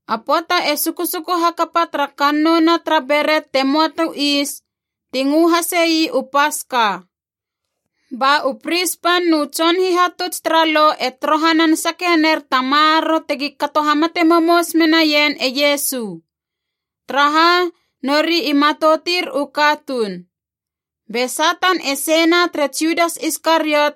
A pöata e susuku hakapa tara Kannouna tara Beret te möa tu Is, ti ngö hasei u Paska. Ba u pris pan nu tson hihatuts tara Lo e torohanan sake ner ta maroro tegi kato hamate momous menaien e Iesu. Taraha? Nori i matoutir u katuun. Be Satan e seina tere Judas Iskariot,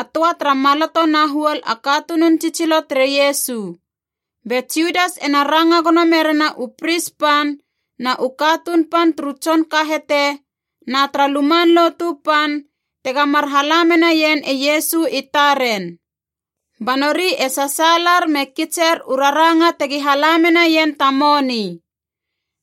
a töa tara maloto na huol a katunun tsitsilo tere Iesu. Be Judas ena ranga gono merena u pris pan na u katuun pan turu tson kahete na tara Luman Lotu Pan, tega mar hala menaien e Iesu i taren. Ba nori e sasaalar me kitser u raranga tegi hala menaien ta moni.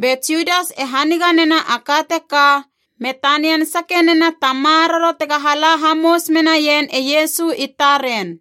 Be Judas e haniga nena a ka teka me tanian sake nena ta maroro tega hala hamous menaien e Iesu i taren.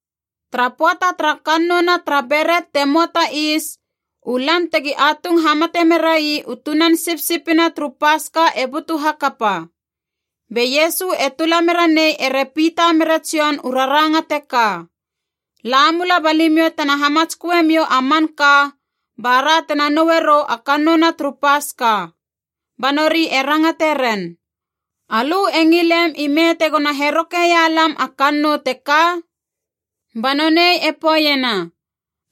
Tara pöata tara Kannouna tara Beret te möa ta Is, u lan tegi atung hamate merai u tunan sipsipina turu Paska e butu hakapa. Be Iesu e tula mera nei ere Pita mere Jon u raranga teka, “La mula ba limiou tena hamatsköe miou a manka, bara tena noue rou a kannouna turu Paska.” Ba nori e rangate ren, “Alö e ngilem ime tegona herokeia lam a kannou teka?” Ba nonei e poeiena,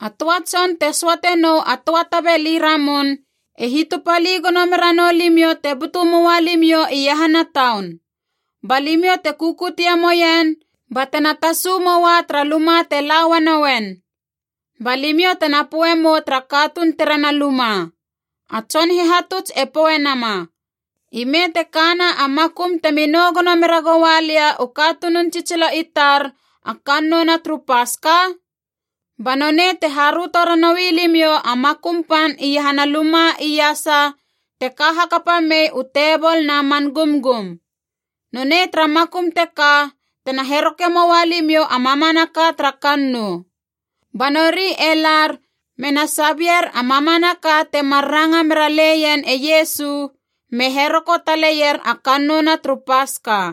“A töa tson te söate nou a töa tabeli ramun e hitupali gono mera nou limiou te butu moa limiou iahana taun. Ba limiou te kukutie moien batena tasu moa tara luma te la uanouen. Ba limiou tena poe mou tara katuun terena luma, ‘A Tson Hihatuts e poe nama, Ime te kana a makum temi nou gono mera goua lia u katunun tsitsilo i tar a kannouna turu Paska?’ Ba nonei te haröto ranoui limiou a makum pan iahana luma iasa te ka hakapa mei u tebol na man gumgum. Nonei tara makum teka tena heroke moa limiou a mamanaka tara kannou.” Ba nori e lar mena sabier a mamanaka temar ranga mera leien e Iesu, me heroko taleier a kannouna turu Paska.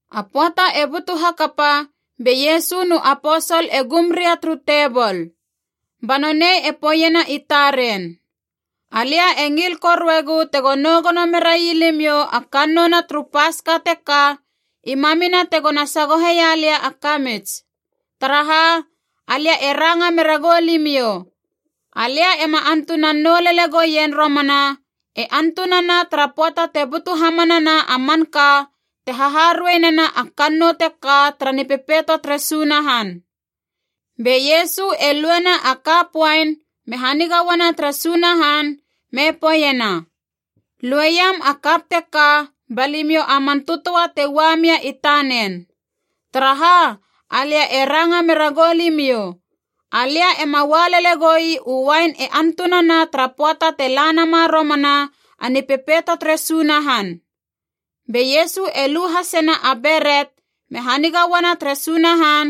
A pöata e butu hakapa be Iesu nu aposol e gum ria turu tebol. Ba nonei e poeiena i taren, “Alia e ngil koruegu tego nou gono merai limiou a kannouna turu Paska teka i mamina tegona sagoheia lia a kamits! Taraha? Alia e ranga mera goulimiou, alia ema antunan nou lele gouien romana e antunana tara pöata te butu hamanana a manka te haharuei nena a kannou teka tara Nipepeito tere Sunahan.” Be Iesu e luena a kap uain me haniga uana tere Sunahan me poeiena, “Lueiam a kap teka ba limiou a man tötöa te ua mia i tanen. Taraha? Alia e ranga mera goulimiou, alia ema ua lele gou ii u uain e antunana tara pöata te la nama romana a Nipepeito tere Sunahan.” Be Iesu e lu hasena a beret me haniga uana tere Sunahan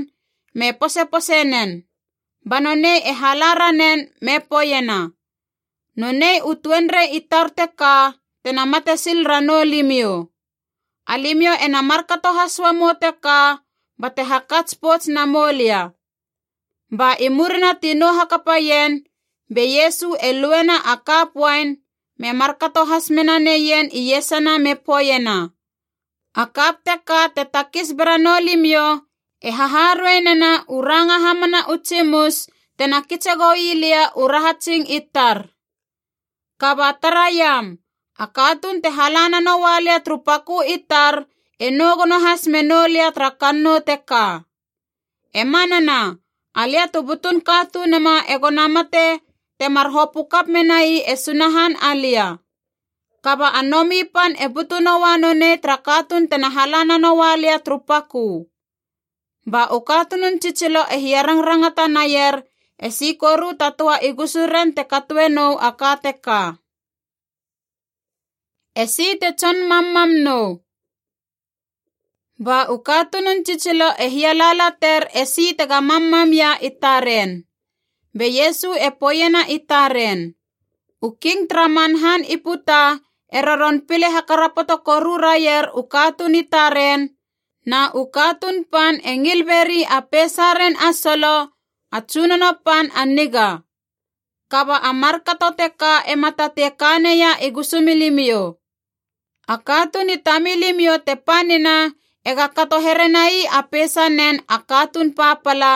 me posepose nen. Ba nonei e hala ranen me poeiena, “Nonei u tuenrei i tar teka tena mate sil ranou limiou. Alimiou ena markato has uamou teka bate hakats pouts namou lia.” Ba i murina ti nou hakapaien, be Iesu e luena a kap uain me markato has mena neien iesana me poeiena, “A kap teka te takis bera noulimiou e haharuei nena u ranga hamana u tsimus tena kitse gou ii lia u rahatsing i tar. “Kaba taraiam, a katuun te hala nanoua lia turu pakö i tar e nou gono has menou lia tara kannou teka! E manana, alia tu butun Katunuma egona mate, temar hopö kap menai e Sunahan alia. Kaba a nomi pan e butu noua nonei tara katuun tena hala nanoua lia turu pakö!” Ba u katunun tsitsilo e hiarangrangata naier esi koru ta töa i gusuren te katoe nou a ka teka. Esi te tson mammam nou? Ba u katunun tsitsilo e hialaalater esi tega mammamia i taren. Be Iesu e poeiena i taren, “U king tara man han i puta e roron pile hakarapoto koru raier u katuun i taren, na u katuun pan e ngil beri a peisaren a solo ‘A Tsunono Pan a Niga.’ Kaba a markato teka ema tatei ka neia i gusumilimiou. A katuun i tamilimiou te panina ega kato here nai a peisanen a katuun papala,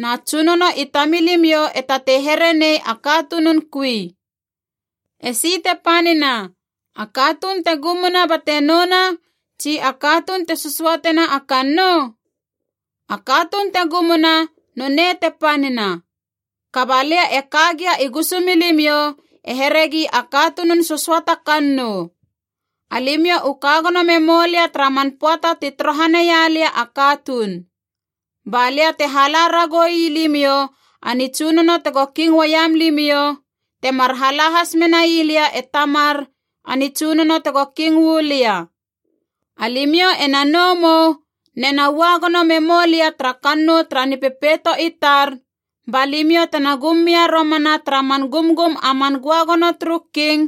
na tsunono i tamilimiou e tatei here nei a katunun kui. Esi te panina, a katuun te gumuna bate nouna, tsi a katuun te sösöatena a kannou? A katuun te gumuna, nonei te panina. Kaba lia e ka gia i gusumilimiou e heregi a katunun sösöata kannou. Alimiou u ka gono memoulia tara man pöata ti torohaneia lia u katuun. Ba lia te hala ragou ii limiou a nitsunono tego king uaiam limiou, temar hala has menai lia e Tamar a nitsunono tego king uu lia. Alimiou ena nou mou nena ua gono memou lia tara kannou tara Nipepeito i tar, ba limiou tena gum mia romana tara man gumgum a man göagono turu king,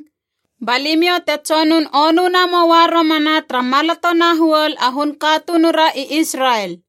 ba limiou te tsonun onuna moua romana tara maloto na huol a hun katunura i Israel.”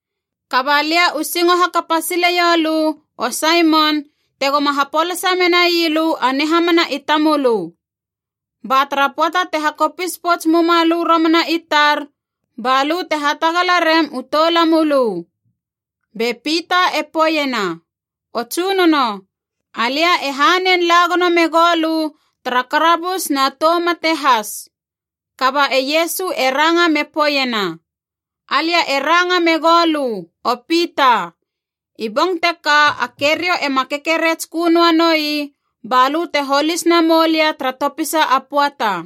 Kaba lia u singo hakapa sileiou lö, o Saimon, tegoma hapolasa menai lö a nihamana i tamölö. Ba tara pöata te hakopis pouts muma lö romana i tar, ba lö te hatagala rem u toulamölö.” Be Pita e poeiena, “O Tsunono, alia e hanein la gono megou lö tara karabus na tou mate has!” Kaba e Iesu e ranga me poeiena, “Alia e ranga megou lö, o Pita, i bong teka a keriou ema kekeretskö noa noi ba lö te holis namou lia tara topisa a pöata.”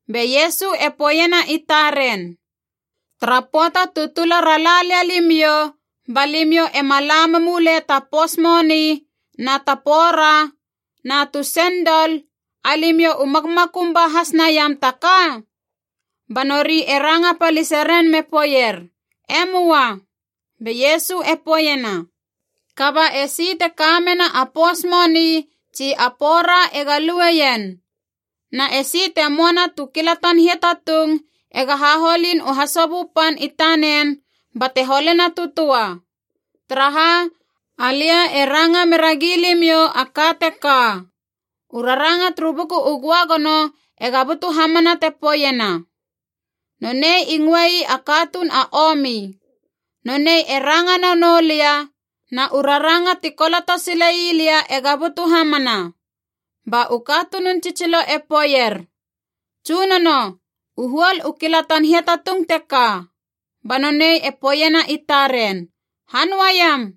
Be Iesu e poeiena i taren, “Tara pöata tu tula ra lia limiou, ba limiou ema la memule ta pous moni na ta pora na tu sendol, alimiou u makmakum ba has naiam ta ka?” Ba nori e ranga palise ren me poeier. “E möa.” Be Iesu e poeiena, “Kaba esi te ka mena a pous moni tsi a pora ega lueien. Na esi te möana tu kilatan hiatatung ega haholin u hasobö pan i tanen bate holena tu töa. Taraha? Alia e ranga mera gilimiou a ka teka: u raranga turu Buku u Göagono ega butu hamana te poeiena, ‘Nonei i ngöe ii a katuun a omi.’ Nonei e ranga nanou lia, na u raranga ti koloto sile ii lia ega butu hamana.” Ba u katunun tsitsilo e poeier, “Tsunono, u huol u kilatan hiatatung teka.” Ba nonei e poeiena i taren, “Hanöa iam!”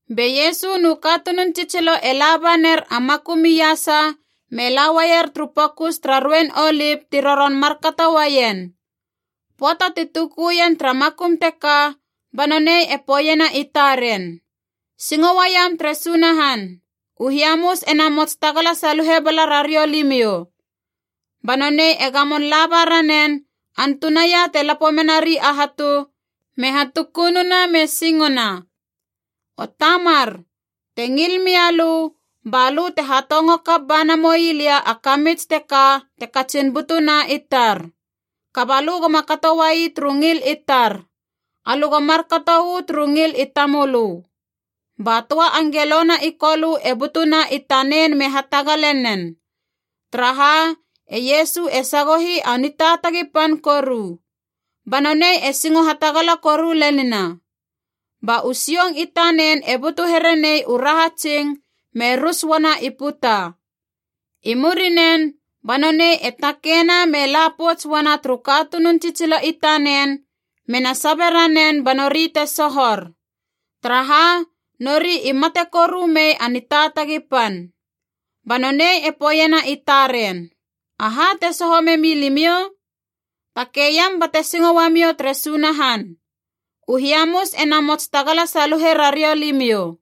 Be Iesu nu katunun tsitsilo e laba ner a makum iasa me la uaier turu Pokus tara Ruein Olip ti roron markato uaien. Pöata ti tukuien tara makum teka, ba nonei e poeiena i taren, “Singo uaiam tere Sunahan. U hiamus e namots tagala saluhe bala rariou limiou.” Ba nonei e gamon laba ranen, antunaia te lapo menari a hatu, me hatukununa me singona, “O Tamar, te ngil mia lö, ba lö te hatongo kap ba namoi lia a kamits teka te katsin butuna i tar. Kaba lö goma kato uai turu ngil i tar. Alö go markato uu turu ngil i tamölö.” Ba töa angelona i Kolö e butuna i tanen me hatagale nen. Taraha? E Iesu e sagohi a nitaatagi pan koru. Ba nonei e singo hatagala koru lenina. Ba u sioung i tanen e butu here nei u rahatsing me rus uana i puta. I murinen ba nonei e takeina me la pouts uana turu katunun tsitsilo i tanen mena sabe ranen ba nori te sohor. Taraha? Nori i mate koru mei a nitaatagi pan. Ba nonei e poeiena i taren, “Aha te soho memi limiou? Takei iam bate singo uamiou tere Sunahan. U hiamus e namots tagala saluhe rariou limiou.”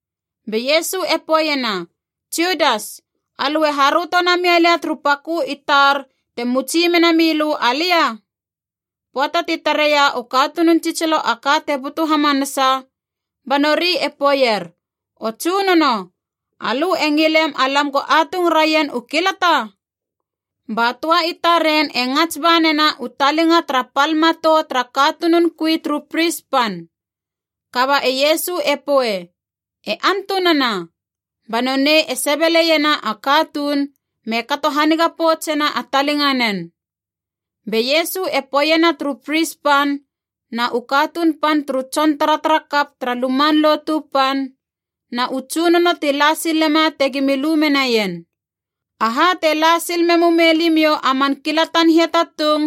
Be Iesu e poeiena, “Judas, alö e haröto namia lia turu pakö i tar te mutsi mena milö alia?” Pöata ti tareia u katunun tsitsilo a ka te butu hamanasa, ba nori e poeier, “O Tsunono, alö e ngilem alam go atung raien u kilata?” Ba töa i taren e ngats ba nena u talinga tara pal matou tara katunun kui turu pris pan. Kaba e Iesu e poe, “E antunana!” Ba nonei e sebeleiena a katuun me kato haniga poutsena a talinganen. Be Iesu e poeiena turu pris pan na u katuun pan turu tson taratara kap tara Luman Lotu Pan na u tsunono ti la silema tegimi lu menaien, “Aha te la sil memu mei limiou a man kilatan hiatatung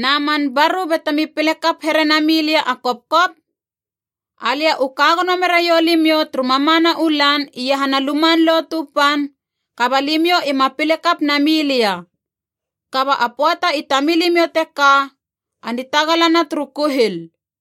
na man baru batemi pile kap here nami lia a kopkop? Alia u ka gono meraiou limiou turu mamana u lan iahana Luman Lotu Pan, kaba limiou ima pile kap nami lia. Kaba a pöata i tamilimiou teka, a nitagalana turu kuhil.”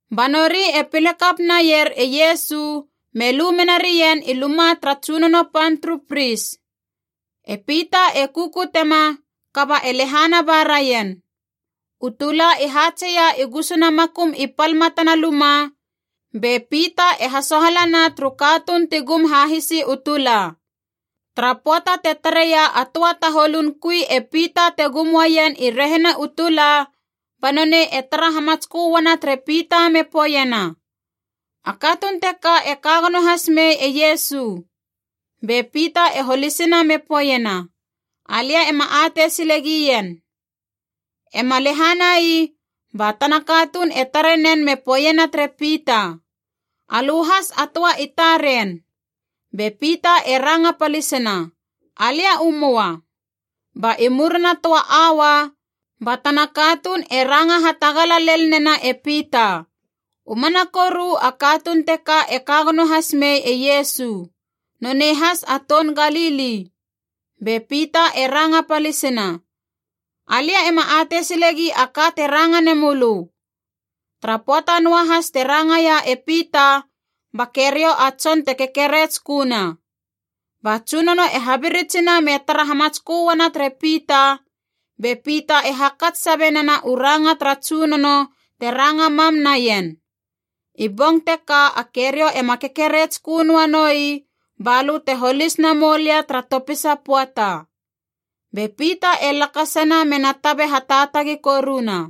Ba nori e pile kap naier e Iesu me lu mena rien i luma tara tsunono pan turu pris. E Pita e kukutema, kaba e lehana ba raien. U tula i haatseia i gusuna makum i pal matana luma, be Pita e hasohalana turu katuun ti gum hahisi u tula. Tara pöata te tareia a töa taholun kui e Pita te gum uaien i rehina u tula, ba nonei e tara hamatskö uana tere Pita me poeiena, “A katuun teka e ka gono has mei e Iesu!” Be Pita e holisina me poeiena, “Alia ema atei sile gien!” Ema lehanai, ba tana katuun e tare nen me poeiena tere Pita, “Alö has a töa i taren!” Be Pita e ranga palisina, “Alia u möa!” Ba i murina töa aua, ba tana katuun e ranga hatagala lel nena e Pita, “U mana koru a katuun teka e ka gono has mei e Iesu. Nonei has a toun Galili!” Be Pita e ranga palisina, “Alia ema atei silegi a ka te ranga nemölö!” Tara pöata noa has te rangaia e Pita, ba keriou a tson te kekeretsköna. Ba Tsunono e habiritsina me tara hamatskö uana tere Pita, be Pita e hakats sabe nena u ranga tara Tsunono te ranga mam naien, “I bong teka a keriou ema kekeretskö noa noi balö te holis namou lia tara topisa pöata.” Be Pita e lakasana me na tabe hataatagi koruna.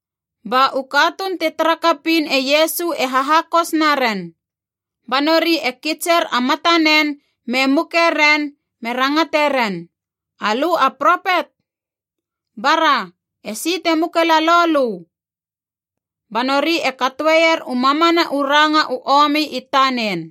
Ba u katuun ti tara kapiin e Iesu e hahakos naren. Ba nori e kitser a matanen me muke ren me rangate ren, “Alö a propet? Bara, esi te muke lalou lö?” Ba nori e katoeier u mamana u ranga u omi i tanen.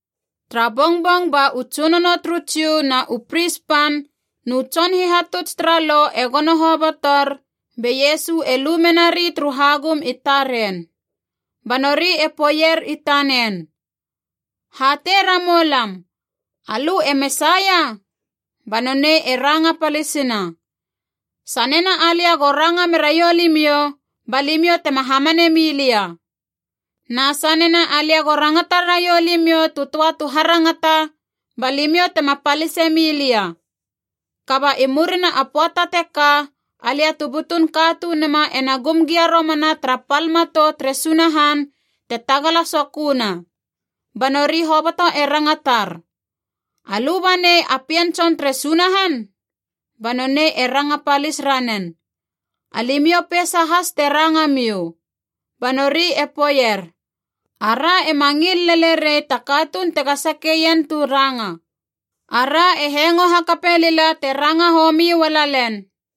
Tara bongbong ba u tsunono turu Jiu na u pris pan nu tson hihatuts tara Lo e gono hobotor, be Iesu e lu menari turu hagum i taren. Ba nori e poeier i tanen, “Hatei ramoulam, alö e Mesaia?” Ba nonei e ranga palisina, “Sanena alia go ranga meraiou limiou, ba limiou tema hamane mi lia. Na sanena alia go rangata raiou limiou tu töa tu harangata, ba limiou tema palise mi lia. Kaba i murina a pöata teka, alia tu butun Katunuma ena gum gia romana tara pal matou tere Sunahan te Tagala Soköna!” Ba nori hoboto e rangatar, “Alö banei a Pien Tson tere Sunahan?” Ba nonei e ranga palis ranen, “Alimiou peisa has te ranga miou.” Ba nori e poeier, “Ara ema ngil lele rei ta katuun tega sakeien tu ranga! Ara e hengo hakape lila te ranga homi ua lalen.”